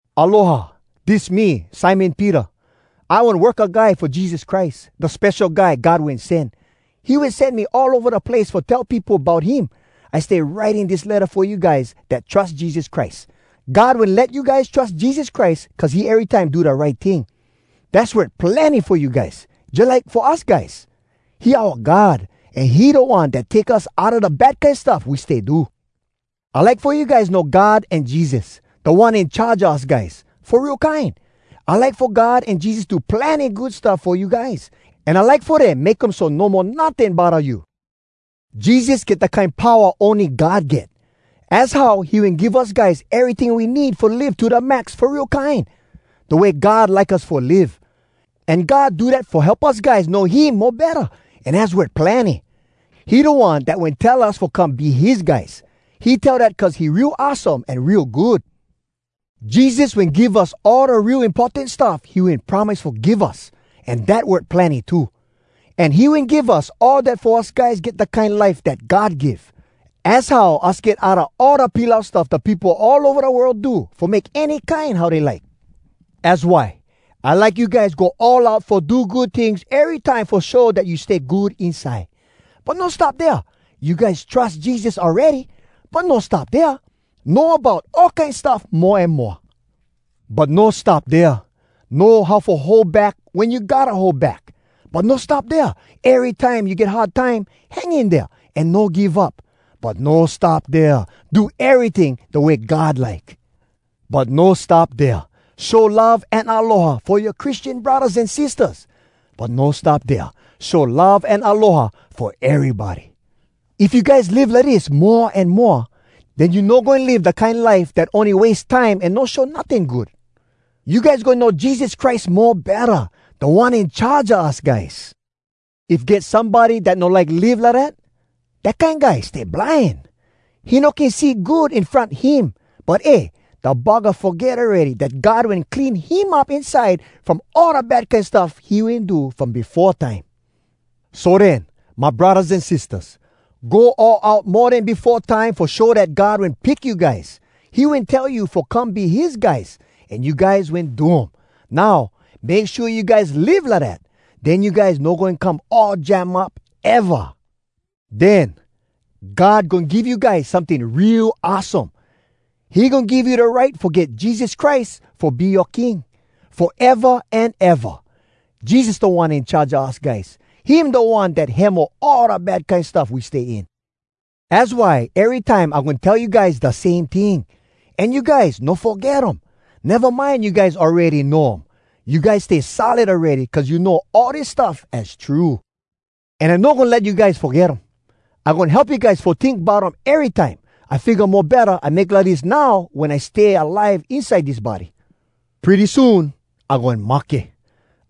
Aloha! Dis me, Simon Peter. I one worka guy fo Jesus Christ, da Spesho Guy God Wen Sen. He wen sen me all ova da place fo tell peopo bout him. I stay writing dis letta fo you guys dat trus Jesus Christ. God wen let you guys trus Jesus Christ cuz he erytime do da right ting. Dass worth plenny fo you guys, jalike fo us guys. He oua God, an he da One dat take us outa da bad kine stuff we stay do. I like fo you guys know God an Jesus, Da One In Charge a us guys, fo real kine. I like fo God an Jesus do plenny good stuff fo you guys. An I like fo dem make um so no mo notting bodda you. Jesus get da kine powa ony God get. Az how he wen give us guys eryting we need fo live to da max fo real kine, da way God like us fo live. An God do dat fo help us guys know him mo betta, an az worth plenny. He da One dat wen tell us fo come be his guys! He tell dat cuz he real awesome an real good. Jesus wen give us all da real importan stuff he wen promise fo give us, an dat worth plenny too. An he wen give us all dat fo us guys get da kine life dat God give. Az how us get outa all da pilau stuff da peopo all ova da world do fo make any kine how dey like. Az why, I like you guys go all out fo do good tings erytime fo show dat you stay good inside. But no stop dea. You guys trus Jesus awready. But no stop dea. Know about all kine stuff mo an moa. But no stop dea. Know how fo hold back wen you gotta hold back. But no stop dea. Erytime you get hard time, hang in dea an no give up. But no stop dea. Do eryting da way God like. But no stop dea. Show love an aloha fo yoa Christian braddahs an sistahs. But no stop dea. Show love an aloha fo erybody. If you guys live lidis mo an moa, den you no goin live da kine life dat ony wase time an no show notting good. You guys goin know Jesus Christ mo betta, Da One In Charge a us guys. If get somebody dat no like live lidat, dat kine guy stay blind. He no can see good in front him. But eh! Da buggah foget awready dat God wen clean him up inside from all da bad kine stuff he wen do from befo time. So den, my braddahs an sistahs, go all out mo den befo time fo show dat God wen pick you guys. He wen tell you fo come be his guys, an you guys wen do um. Now, make shua you guys live lidat. Den you guys no goin come all jam up, eva. Den, God goin give you guys someting real awesome. He goin give you da right fo get Jesus Christ fo be yoa King, foeva an eva! Jesus Da One In Charge a us guys. Him da One dat hemo all da bad kine stuff we stay in. Az why erytime I goin tell you guys da same ting. An you guys no foget um. Neva mind you guys awready know um. You guys stay solid awready cuz you know all dis stuff az true. An I no goin let you guys foget um. I goin help you guys fo tink bout um erytime. I figga mo betta I make lidis now wen I still stay alive inside dis body. Pretty soon I goin mahke.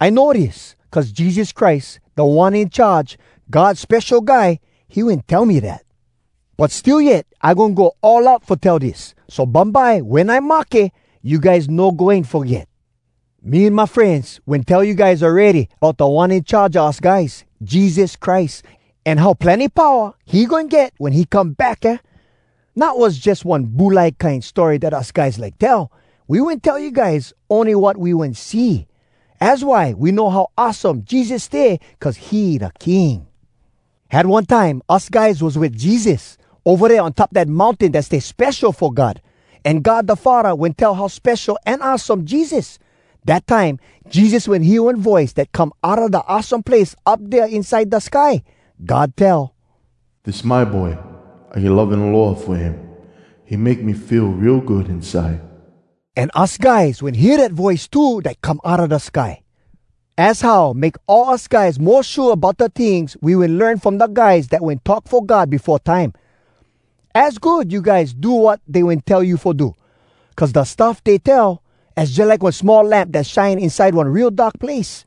I know dis, cuz Jesus Christ, Da One In Charge, God Spesho Guy, he wen tell me dat. But still yet I goin go all out fo tell dis, so bumbye wen I mahke, you guys no goin foget. Me an my frenz wen tell you guys awready bout Da One In Charge a us guys, Jesus Christ, an how plenny powa he goin get wen he come back, aah? Not was jus one bulai kine story dat us guys like tell. We wen tell you guys ony wat we wen see! Az why we know how awesome Jesus stay cuz he da King! Had one time us guys was wit Jesus, ova dea on top dat mountain dat stay spesho fo God. An God da Faddah wen tell how spesho an awesome Jesus. Dat time, Jesus wen hear one voice dat come outa da Awesome Place up dea inside da sky. God tell, “Dis my Boy! I get love an aloha fo him. He make me feel real good inside!” An us guys wen hear dat voice too dat come outa da sky. Az how make all us guys mo shua bout da tings we wen learn from da guys dat wen talk fo God befo time. Az good you guys do wat dey wen tell you fo do! Cuz da stuff dey tell, az jalike one small lamp dat shine inside one real dark place.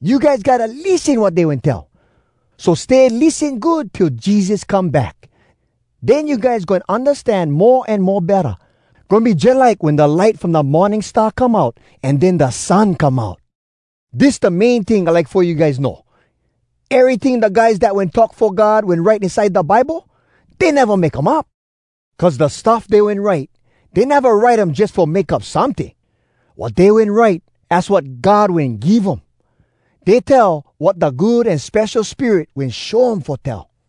You guys gotta lissen wat dey wen tell. So stay lissen good till Jesus come back! Den you guys goin undastan mo an mo betta. Goin be jalike wen da light from da morning star come out, an den da sun come out! Dis da main ting I like fo you guys know: Eryting da guys dat wen talk fo God wen write inside da Bible, dey neva make um up! Cuz da stuff dey wen write, dey neva write um jus fo make up someting. Wat dey wen write, az wat God wen give um. Dey tell wat da Good An Spesho Spirit wen show um fo tell.